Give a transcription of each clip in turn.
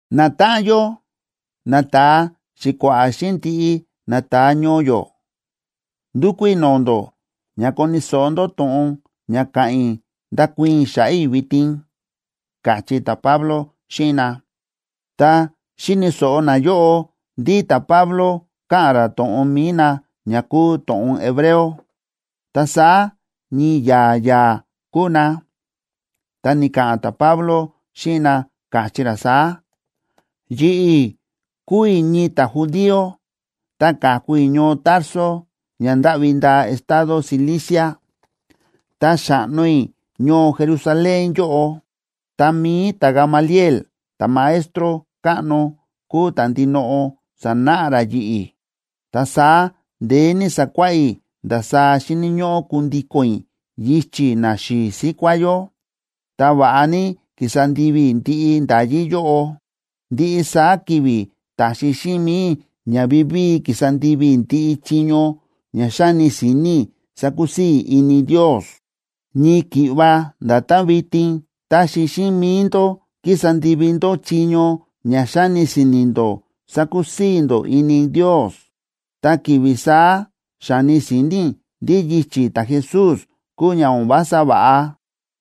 ―Natáꞌan yó, nata̱a xi̱kua̱ꞌa̱ xíꞌin ndiꞌi nata̱a ñoo yó, ndúkú i̱ no̱o̱ ndó ña koni̱ so̱ꞌo ndó to̱ꞌon ña ka̱ꞌa̱n i̱ ndakuii̱n i̱ xa̱ꞌa̱ i̱ vitin ―káchí ta̱Pablo xíꞌin na. Tá xi̱ni̱ so̱ꞌo nayóꞌo ndí ta̱Pablo káꞌa̱n ra to̱ꞌon mi̱i na ña kúu to̱ꞌon hebreo, ta saá ñii ya̱a̱ ya̱a̱ kúu na. Ta ni̱ka̱ꞌa̱n ta̱Pablo xíꞌin na, káchí ra saá: ―Yi̱ꞌi̱ kúu i̱ ñii ta̱judío, ta ka̱ku i̱ ñoo Tarso, ña ndáꞌvi ndaa estado Cilicia, ta xa̱ꞌno i̱ ñoo Jerusalén yóꞌo. Ta mi̱i ta̱Gamaliel, ta̱maestro káꞌno, kúu ta̱ ndinoꞌo sa̱náꞌa ra yi̱ꞌi̱. Ta saá ndeé ní sa̱kuáꞌá i̱ ndasaá xíni̱ ñóꞌó kundíko̱n i̱ yichi̱ naxi̱i̱ síkuá yó, ta va̱ꞌa ní ki̱sa ndivi i̱ ndiꞌi nda̱yí yóꞌo. Ndiꞌi saá ki̱vi̱ ta̱xi xíꞌin mi̱i i̱ ña vivíi kísa ndivi i̱ ndiꞌi chiño ña xa̱ni si̱ni̱ i̱ sakusii̱ i̱ ini Ndios, ñii ki̱ꞌva nda̱tán vitin táxi xíꞌin mi̱i ndó kísa ndivi ndó chiño ña xáni si̱ni̱ ndó sakusii̱ ndó ini Ndios. Ta ki̱vi̱ saá xa̱ni si̱ni̱ i̱ ndí yichi̱ ta̱Jesús kúu ña o̱n vása va̱ꞌa,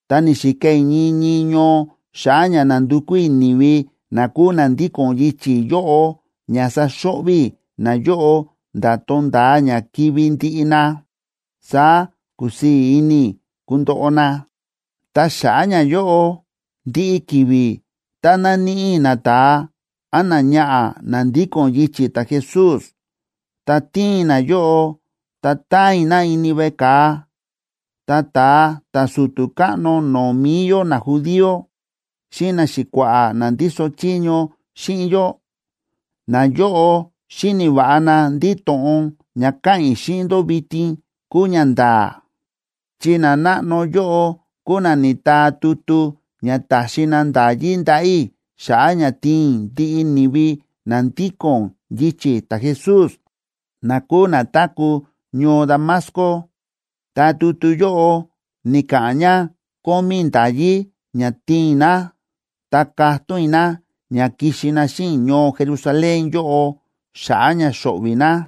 ta ni̱xika i̱ ñii ñii ñoo xa̱ꞌa̱ ña nandukú i̱ ni̱vi na kúu na ndíko̱n yichi̱ yóꞌo ña saxo̱ꞌvi̱ i̱ nayóꞌo nda̱ tonda̱a ña kivi̱ ndiꞌi na, saá ku̱sii̱ ini i̱ kundoꞌo na. Ta xa̱ꞌa̱ ñayóꞌo, ndiꞌi ki̱vi̱ tá na̱níꞌi i̱ nata̱a án náñaꞌa̱ na ndíko̱n yichi̱ ta̱Jesús, ta ti̱in i̱ nayóꞌo ta ta̱an i̱ na ini veꞌe ka̱a. Ta ta̱a ta̱su̱tu̱ káꞌno no̱o̱ mi̱i yó najudío xíꞌin naxi̱kua̱ꞌa̱ na ndíso chiño xíꞌin yó, nayóꞌo xíni̱ va̱ꞌa na ndí to̱ꞌon ña káꞌa̱n i̱ xíꞌin ndó vitin kúu ñanda̱a̱, chi nanáꞌno yóꞌo kúu na ni̱taa tutu ña ta̱xi na nda̱yí ndaꞌa̱ i̱ xa̱ꞌa̱ ña tiin i̱ ndiꞌi ni̱vi na ndíko̱n yichi̱ ta̱Jesús na kúu na táku̱ ñoo Damasco, ta tutu yóꞌo ni̱ka̱ꞌa̱n ña kómí i̱ nda̱yí ña tiin na, ta katón i̱ na ña kixi na xíꞌin i̱ ñoo Jerusalén yóꞌo xa̱ꞌa̱ ña xo̱ꞌvi̱ na.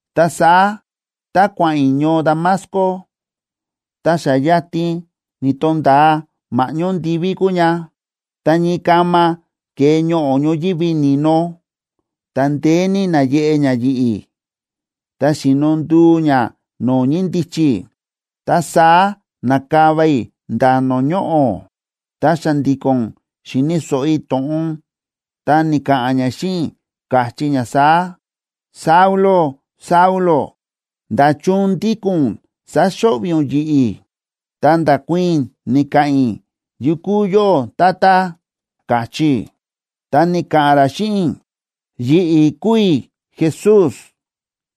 ’Ta saá tá kua̱ꞌa̱n i̱ ñoo Damasco ta xa yatin ni̱to̱nda̱a ma̱ꞌñó ndiví kúu ña, ta ñii kama ke̱e ñoꞌo̱ ñoyívi ni̱no, ta ndeé ní na̱yeꞌe ña yi̱ꞌi̱, ta xi̱no nduu ña no̱o̱ ñíndichi i̱. Ta saá na̱kava i̱ nda̱ no̱o̱ ñoꞌo̱. Ta xa̱ndi̱ko̱n xi̱ni̱ so̱ꞌo i̱ to̱ꞌon, ta ni̱ka̱ꞌa̱n ña xíꞌin i̱, káchí ña saá: “Saulo, Saulo, ¿nda̱chun ndíko̱n ún sáxo̱ꞌvi̱ ún yi̱ꞌi̱?” Ta nda̱kuii̱n i̱, ni̱ka̱ꞌa̱n i̱: “¿Yu kúu yóꞌó, Tata?”, ka̱chí i̱. Ta ni̱ka̱ꞌa̱n ra xíꞌin i̱: “Yi̱ꞌi̱ kúu i̱ Jesús,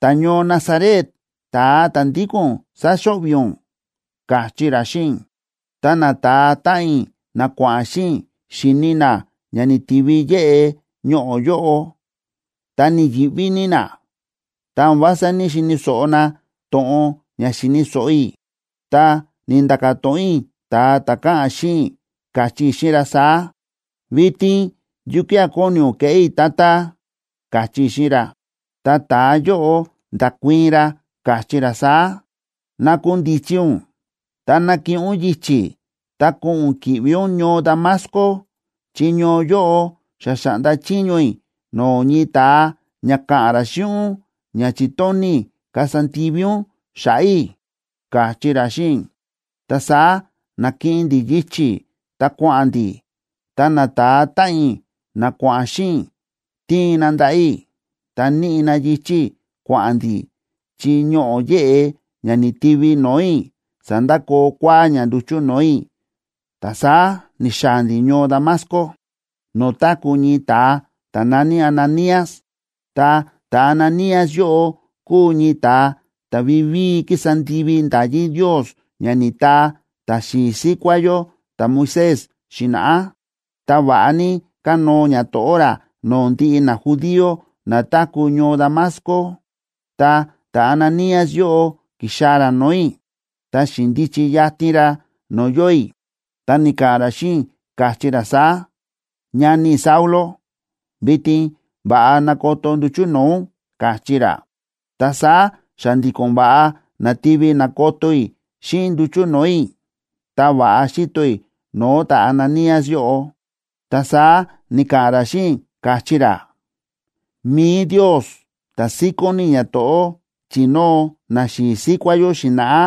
ta̱ñoo Nazaret, ta̱a ta̱ ndíko̱n ún sáxo̱ꞌvi̱ ún”, káchí ra xíꞌin i̱. Ta nata̱a táꞌan i̱ na kua̱ꞌa̱n xíꞌin i̱ xi̱ni na ña ni̱tivi yéꞌe ñoꞌo̱ yóꞌo, ta ni̱yi̱ꞌví ní na, ta o̱n vása ní‑xini̱ so̱ꞌo na to̱ꞌon ña xi̱ni̱ so̱ꞌo i̱. Ta ni̱nda̱ka̱ to̱ꞌon i̱ ta̱a ta̱ káꞌa̱n xíꞌin i̱, káchí i̱ xíꞌin ra saá: “¿Vitin yukía̱ kóni ún keꞌé i̱, Tata?”, káchí i̱ xíꞌin ra. Ta ta̱a yóꞌo nda̱kuii̱n ra, káchí ra saá: “Nakundichi ún, ta nakiꞌin ún yichi̱, ta ko̱ꞌo̱n ún ki̱ꞌvi ún ñoo Damasco, chi ñoo yóꞌo xa xa̱ꞌnda chiño i̱ no̱o̱ ñii ta̱a ña ka̱ꞌa̱n ra xíꞌin ún ña chi̱tóni̱ i̱ kasa ndivi ún xa̱ꞌa̱ i̱”, káchí ra xíꞌin i̱. Ta saá na̱kiꞌin ndi̱ yichi̱ ta kua̱ꞌa̱n ndi̱, ta nata̱a táꞌan i̱ na kua̱ꞌa̱n xíꞌin i̱, ti̱in na ndaꞌa̱ i̱, ta níꞌi na yichi̱ i̱ kua̱ꞌa̱n ndi̱, chi ñoꞌo̱ yéꞌe ña ni̱ti̱vi no̱o̱ i̱ sa̱ndakoo kua̱á ña nduchu̱ no̱o̱ i̱. Ta saá ni̱xaa̱ ndi̱ ñoo Damasco, no̱o̱ táku̱ ñii ta̱a ta̱ na̱ní Ananías. Ta ta̱Ananías yóꞌo kúu ñii ta̱a ta̱ vivíi kísa ndivi nda̱yí Ndios ña ni̱taa ta̱xi̱i̱ síkuá yó ta̱Moisés xi̱na̱ꞌá, ta va̱ꞌa ní kánóo ñato̱ꞌó ra no̱o̱ ndiꞌi najudío na táku̱ ñoo Damasco. Ta ta̱Ananías yóꞌo ki̱xaa̱ ra no̱o̱ i̱, ta xi̱ndichi yatin ra no̱o̱ yóo i̱, ta ni̱ka̱ꞌa̱n ra xíꞌin i̱, káchí ra saá: “Ñani i̱ Saulo, vitin va̱ꞌa nakoto nduchu̱ no̱o̱ ún”, káchí ra. Ta saá xa̱ndi̱ko̱n va̱ꞌa na̱tivi na̱koto i̱ xíꞌin nduchu̱ no̱o̱ i̱, ta va̱ꞌa xi̱to i̱ no̱o̱ ta̱Ananías yóꞌo. Ta saá ni̱ka̱ꞌa̱n ra xíꞌin i̱, káchí ra: “Mi̱i Ndios, ta̱ síkón ní ñato̱ꞌó chi̱nóo naxi̱i̱ síkuá yó xi̱na̱ꞌá,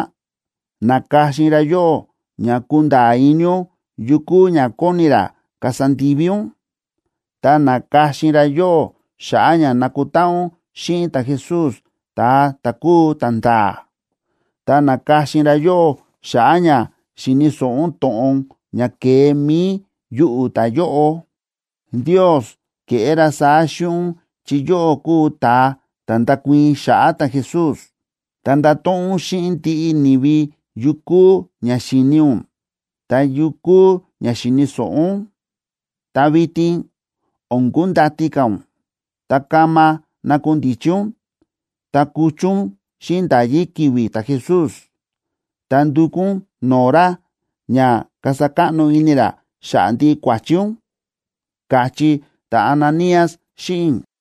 na̱ka̱xin ra yóꞌó ña kunda̱a̱ ini ún yu kúu ña kóni ra kasa ndivi ún. Ta na̱ka̱xin ra yóꞌó xa̱ꞌa̱ ña na̱kutáꞌan ún xíꞌin ta̱Jesús ta̱a ta̱ kúu ta̱nda̱a̱. Ta na̱ka̱xin ra yóꞌó xa̱ꞌa̱ ña xi̱ni̱ so̱ꞌo ún to̱ꞌon ña ke̱e mi̱i yuꞌu̱ ta̱yóꞌo. Ndios ke̱ꞌé ra saá xíꞌin ún chi yóꞌó kuu ún ta̱a ta̱ ndakuii̱n xa̱ꞌa̱ ta̱Jesús, ta ndato̱ꞌon ún xíꞌin ndiꞌi ni̱vi yu kúu ña xi̱ni ún, ta yu kúu ña xi̱ni̱ so̱ꞌo ún. Ta vitin o̱n kundati ka̱ ún, ta kama nakundichi ún ta kuchu ún xíꞌin nda̱yí ki̱vi̱ ta̱Jesús, ta ndukú ún no̱o̱ ra ña kasa káꞌno ini ra xa̱ꞌa̱ ndiꞌi kua̱chi ún”, káchí ta̱Ananías xíꞌin i̱.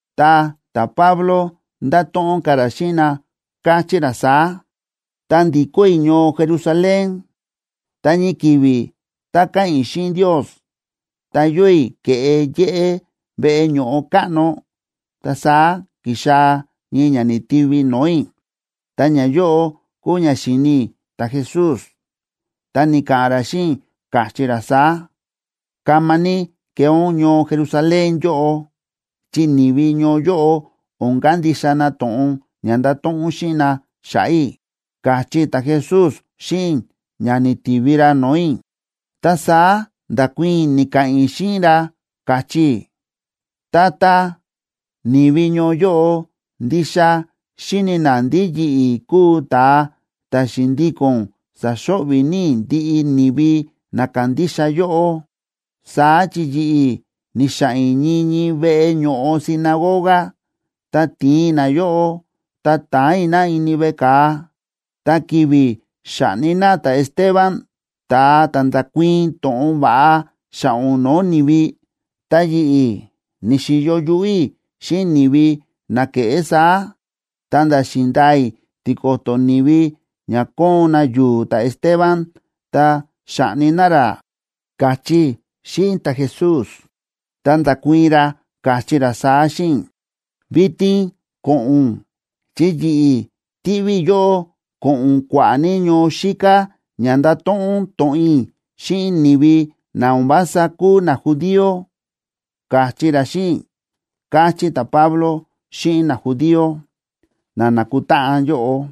Ta ta̱Pablo nda̱to̱ꞌon ka̱ ra xíꞌin na, káchí ra saá: ―Tá ndi̱kó i̱ ñoo Jerusalén, ta ñii ki̱vi̱ tá káꞌa̱n i̱ xíꞌin Ndios, ta yóo i̱ ke̱ꞌe yéꞌé veꞌe ño̱ꞌo káꞌno, ta saá ki̱xaa̱ ñii ña ni̱tivi no̱o̱ i̱. Ta ñayóꞌo kúu ña xi̱ni i̱ ta̱Jesús, ta ni̱ka̱ꞌa̱n ra xíꞌin i̱, káchí ra saá: “Kama ní kee ún ñoo Jerusalén yóꞌo, chi ni̱vi ñoo yóꞌo o̱n kandixa na to̱ꞌon ña ndato̱ꞌon ún xíꞌin na xa̱ꞌa̱ i̱”, káchí ta̱Jesús xíꞌin i̱, ña ni̱tivi ra no̱o̱ i̱. Ta saá nda̱kuii̱n i̱ ni̱ka̱ꞌa̱n i̱ xíꞌin ra, káchí i̱: “Tata, ni̱vi ñoo yóꞌo ndixa xíni̱ na ndí yi̱ꞌi̱ kúu ta̱a ta̱ xi̱ndíko̱n sa̱xo̱ꞌvi̱ ní i̱ ndiꞌi ni̱vi na kándixa yóꞌó. Saá chi yi̱ꞌi̱ ni̱xa̱ꞌa̱n i̱ ñii ñii veꞌe ño̱ꞌo sinagoga, ta ti̱in i̱ nayóꞌo ta ta̱an i̱ na ini veꞌe ka̱a. Ta ki̱vi̱ xa̱ꞌni na ta̱Esteban, ta̱a ta̱ nda̱kuii̱n to̱ꞌon va̱ꞌa xa̱ꞌa̱ ún no̱o̱ ni̱vi, ta yi̱ꞌi̱, ni̱xi̱yo yuꞌú i̱ xíꞌin ni̱vi na kéꞌé saá, ta̱nda̱ xi̱ndaa i̱ tiko̱to̱ ni̱vi ña kóon na yu̱u̱ ta̱Esteban ta xa̱ꞌni na ra”, káchí i̱ xíꞌin ta̱Jesús. Ta nda̱kuii̱n ra, káchí ra saá xíꞌin i̱: “Vitin ko̱ꞌo̱n ún, chi yi̱ꞌi̱ tiꞌví i̱ yóꞌó ko̱ꞌo̱n ún kua̱ꞌa̱ ní ñoo xíká ña ndato̱ꞌon ún to̱ꞌon i̱ xíꞌin ni̱vi na o̱n vása kúu najudío”, káchí ra xíꞌin i̱ ―káchí ta̱Pablo xíꞌin najudío na nákutáꞌan yóꞌo.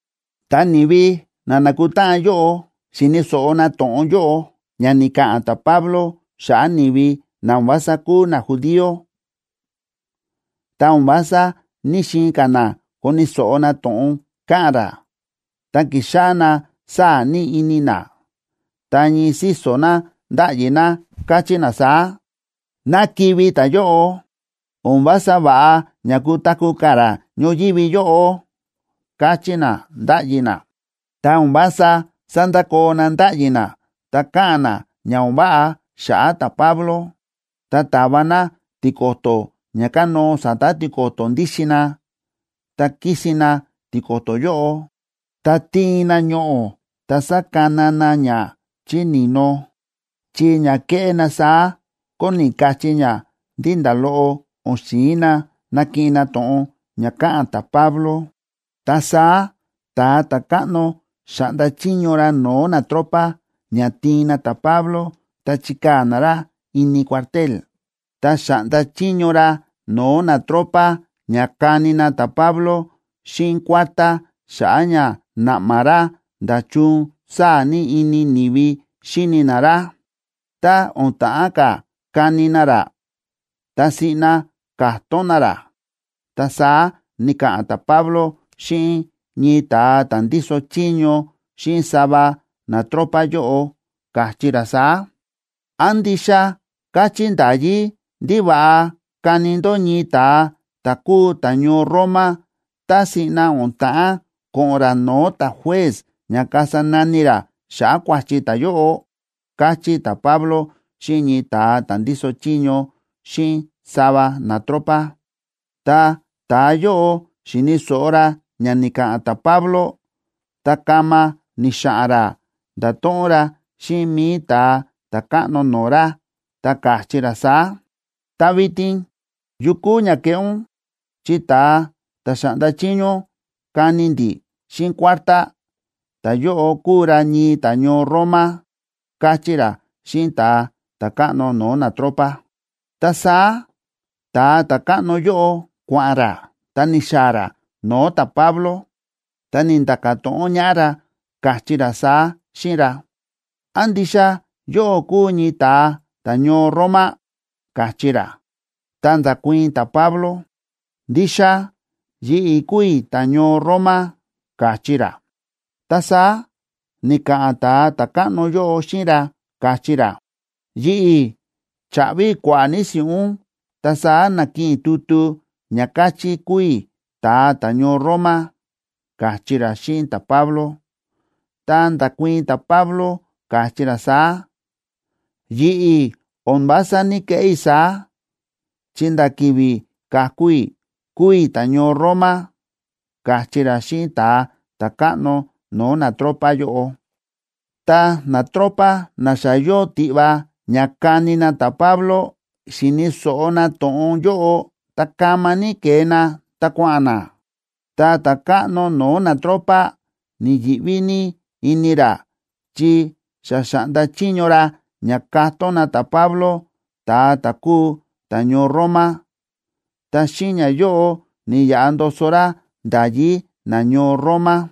Tá ni̱vi na na̱kutáꞌan yóꞌo xi̱ni̱ so̱ꞌo na to̱ꞌon yóꞌo ña ni̱ka̱ꞌa̱n ta̱Pablo xa̱ꞌa̱ ni̱vi na o̱n vása kúu najudío, ta o̱n vása ní‑xiin ka̱ na koni̱ so̱ꞌo na to̱ꞌon káꞌa̱n ra, ta ki̱xáꞌá na sáa̱ ní ini na. Ta ñii síso̱ na ndáꞌyi na, káchí na saá: ―¡Ná kivi̱ ta̱yóꞌo! ¡O̱n vása va̱ꞌa ña kutaku̱ ka̱ ra ñoyívi yóꞌo! ―káchí na, ndáꞌyi na. Ta o̱n vása sándakoo na ndáꞌyi na ta káꞌa̱n na ña o̱n váꞌa xa̱ꞌa̱ ta̱Pablo. Ta ta̱va na tiko̱to̱ ña kánóo sa̱ta̱ tiko̱to̱ ndíxin na, ta kísin na tiko̱to̱ yóꞌo, ta ti̱in na ñoꞌo̱ ta sa̱kana na ña chí ni̱no, chi ña ke̱ꞌé na saá kóni kachí ña ndí nda̱ loꞌo o̱n xi̱in na nakiꞌin na to̱ꞌon ña káꞌa̱n ta̱Pablo. Ta saá ta̱a ta̱káꞌno xa̱ꞌnda chiño ra no̱o̱ natropa ña tiin na ta̱Pablo ta chikaa̱ na ra ini cuartel. Ta xa̱ꞌnda chiño ra no̱o̱ natropa ña kani na ta̱Pablo xíꞌin kuártá xa̱ꞌa̱ ña naꞌma ra nda̱chun sáa̱ ní ini ni̱vi xíni na ra. Tá o̱n ta̱ꞌán ka̱ kani na ra, ta siꞌna ka̱tón na ra. Ta saá ni̱ka̱ꞌa̱n ta̱Pablo xíꞌin ñii ta̱a ta̱ ndíso chiño xíꞌin sava natropa yóꞌo, káchí ra saá: ―¿Án ndixa káchí nda̱yí ndí va̱ꞌa kani ndó ñii ta̱a ta̱ kúu ta̱ñoo Roma tá siꞌna o̱n ta̱ꞌán ko̱ꞌo̱n ra no̱o̱ ta̱juez ña kasa nani ra xa̱ꞌa̱ kua̱chi ta̱yóꞌo? ―káchí ta̱Pablo xíꞌin ñii ta̱a ta̱ ndíso chiño xíꞌin sava natropa. Tá ta̱yóꞌo xi̱ni̱ so̱ꞌo ra ña ni̱ka̱ꞌa̱n ta̱Pablo, ta kama ni̱xa̱ꞌa̱n ra ndato̱ꞌon ra xíꞌin mi̱i ta̱a ta̱káꞌno no̱o̱ ra, ta káchí ra saá: ―Ta vitin, ¿yu kúu ña keꞌé ún?, chi ta̱a ta̱ xa̱ꞌnda chiño ún kani ndi̱ xíꞌin kuártá, ta̱yóꞌo kúu ra ñii ta̱ñoo Roma ―káchí ra xíꞌin ta̱a ta̱káꞌno no̱o̱ natropa. Ta saá ta̱a ta̱káꞌno yóꞌo kua̱ꞌa̱n ra, ta ni̱xaa̱ ra no̱o̱ ta̱Pablo, ta ni̱nda̱ka̱ to̱ꞌon ñaꞌá ra, káchí ra saá xíꞌin ra: ―¿Án ndixa yóꞌó kúu ñii ta̱a ta̱ñoo Roma? ―káchí ra. Ta nda̱kuii̱n ta̱Pablo: ―Ndixa yi̱ꞌi̱ kúu i̱ ta̱ñoo Roma ―káchí ra. Ta saá ni̱ka̱ꞌa̱n ta̱a ta̱káꞌno yóꞌo xíꞌin ra, káchí ra: ―Yi̱ꞌi̱ cha̱ꞌvi i̱ kua̱ꞌa̱ ní si̱ꞌún, ta saá na̱kiꞌin i̱ tutu ña káchí kúu i̱ ta̱a ta̱ñoo Roma ―káchí ra xíꞌin ta̱Pablo. Ta nda̱kuii̱n ta̱Pablo, káchí ra saá: ―Yi̱ꞌi̱ o̱n vása ní‑keꞌé i̱ saá, chi nda̱ ki̱vi̱ ka̱ku i̱ kúu i̱ ta̱ñoo Roma ―káchí ra xíꞌin ta̱a ta̱káꞌno no̱o̱ natropa yóꞌo. Ta natropa na xa yóo tiꞌva ña kani na ta̱Pablo, xi̱ni̱ so̱ꞌo na to̱ꞌon yóꞌo, ta kama ní ke̱e na ta kua̱ꞌa̱n na. Ta ta̱káꞌno no̱o̱ natropa ni̱yi̱ꞌví ní ini ra chi xa xa̱ꞌnda chiño ra ña ka̱tón na ta̱Pablo, ta̱a ta̱ kúu ta̱ñoo Roma, ta xíꞌin ñayóꞌo ni̱yaꞌa ndoso ra nda̱yí nañoo Roma.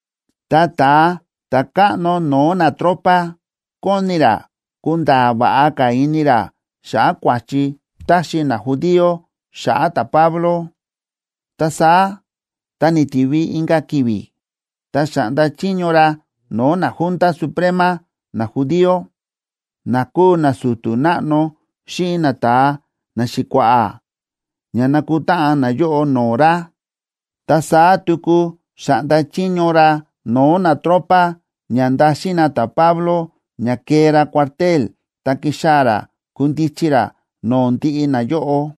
Ta ta̱a ta̱káꞌno no̱o̱ natropa kóni ra kunda̱a̱ va̱ꞌa ka̱ ini ra xa̱ꞌa̱ kua̱chi táxi najudío xa̱ꞌa̱ ta̱Pablo. Ta saá tá ni̱tivi inka̱ ki̱vi̱, ta xa̱ꞌnda chiño ra no̱o̱ naJunta Suprema najudío, na kúu nasu̱tu̱ náꞌno xíꞌin nata̱a naxi̱kua̱ꞌa̱ ña nakutáꞌan nayóꞌo no̱o̱ ra. Ta saá tuku xa̱ꞌnda chiño ra no̱o̱ natropa ña ndaxin na ta̱Pablo, ña kee ra cuartel, ta kixaa̱ ra kundichi ra no̱o̱ ndiꞌi nayóꞌo.